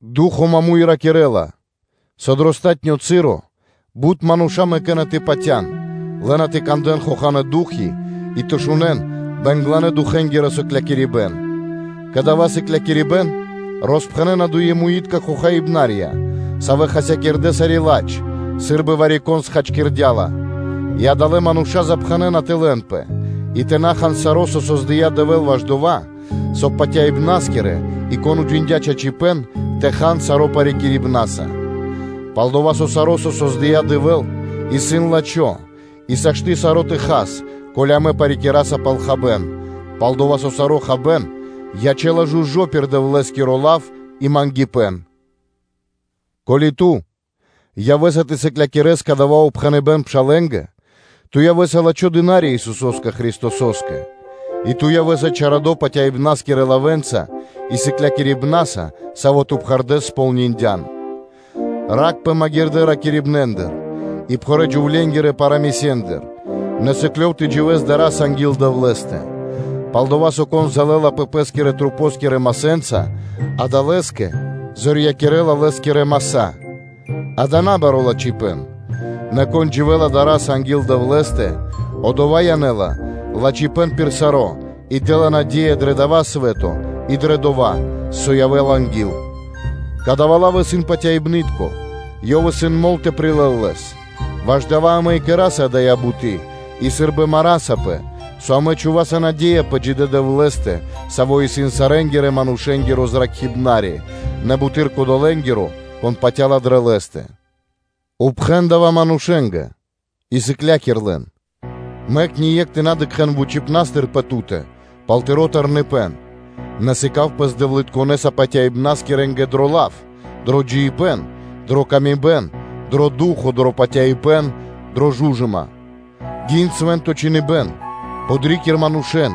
Ду́хо (Фа́но) маму́й ракирэ́ла, со дро палатуно́ (последнё) часо бут мануша́ мэкэ́на тэ патя́н, лэ́на тэ кандэ́н хоханэ́ ду́хи и тэ шунэ́н бэнгланэ-духэнгиро сыклякирибэ́н; кадава́ сыклякирибэ́н роспхэнэна дуемуитка хохаибнарья, савэ́ хасякирдэ́ сари́ ладж, сы́рбы вари-кон схачкирдя́ ла, и адалэ́ мануша́ запхэнэна тэ лэнпэ, и тэ на хан саро́, со создыя́ Дэвэ́л ваш дова́, соб (кай) патяибнаскирэнгэ, и кон уджиндя́ чачипэ́н, тэ хан саро́ парикирибнаса. Пал-дова́ со саро́, со создыя́ Дэвэ́л, исын лачхо́ и сашты́ саро́ тэ хас, ко́ли амэ парикираса пал хабэ́н, пал-дова́ со саро́ хабэ́н ячэ́ла жужо́ пир Дэвлэ́скиро лав и мангипэ́н. Ко́ли ту явэ́са тэ сыклякирэс кадава́ упхэныбэ́н пшалэ́нгэ, ту явэ́са лачхо́ кхангирья́киро дына́ри Исусо́скэ Христосо́скэ, и ту явэ́са чарадо патяибнаскирэ лавэ́нца и сыклякирибнаса, саво́ ту пхэрдэ́с кэрдя́н кэ ко́нцо/яго́ро (сполниндян). Ракхпэ магирдэ́ ракирибнэндыр, и пхурэ́-джувленгирэ парамысендыр, нэ сыклёв тэ дживэ́с дара́са анги́л Дэвлэ́стэ. Пал-дова́ со, кон залэлапэ пэ́скирэ мускулэнца и масэнца, дава́ лэ́скэ зорьякирэла лэ́скирэ маса́-дава́ исын набаро́ лачхипэ́н, нэ кон дживэ́ла дара́са анги́л Дэвлэ́стэ, одова́ янэ́ла лачхипэ́н пир саро́ и дэ́ла наде́я дро дава́ свэ́то и дрэ дова́, со явэ́ла анги́л. Кадава́ лав исын патяибны́тко, ёв исын мол тэ прилэл лэс, ваш дава́ амэ и кэра́са дая́ буты́ и сы́рбы марасапэ, со амэ чхуваса наде́я пэ джидэ́ Дэвлэ́стэ, Саво́ исын сарэнгирэ-манушэ́нгиро Зракхибнари, нэ буты́р кодолэ́нгэ, кон патя́ла дрэ Лэ́стэ. Пхэн зоралэ́с дава́ манушэ́нгэ и сыкля́кир лэн. Мэк ние́кх тэ на дыкхэ́л вучипна́стыр пэ ту́тэ пал тыро́ тэрныпэн; нэ сыка́в пэс дэвлытконэса патяибнаскирэнгэ дро лав, дро джиибэ́н, дрэ паты́в кэ яви́р мануша́, дро ду́хо (фа́но), дро патяибэ́н, дрэ жужыма. Гин Свэ́нто Чхиныбэ́н, подрикир манушэ́н,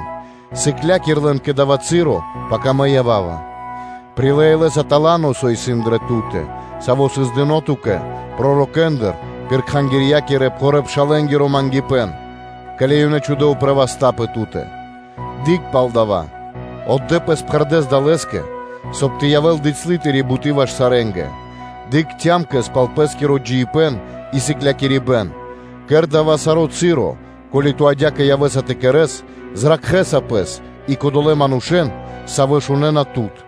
и сыкля́кир лэн кэ дава́ часо, пака мэ ява́ва. Прилэ́ илэ́са тала́но, со исын дрэ ту́тэ, саво́ сыс дыно́ ту́кэ пророкэндыр, пир саво́ кэрдэ́ рашая́, ке́ли ёнэ чхудэ́ упрэ́ васта́ пэ ту́тэ. Дыкх пал дава́, отдэ́ пэс пхэрдэ́с далэскэ, соб (кай) тэ явэ́л бицялы тыри́ буты́ ваш сарэ́нгэ. Дыкх цямкэс пал пэ́скиро джиибэ́н и сыклякирибэ́н, кэр дава́ саро́ часо, ко́ли ту адя́кэ явэ́са тэ кэрэ́с, зракхэ́са пэс и кодолэ́ манушэ́н, савэ́ шунэ́на тут.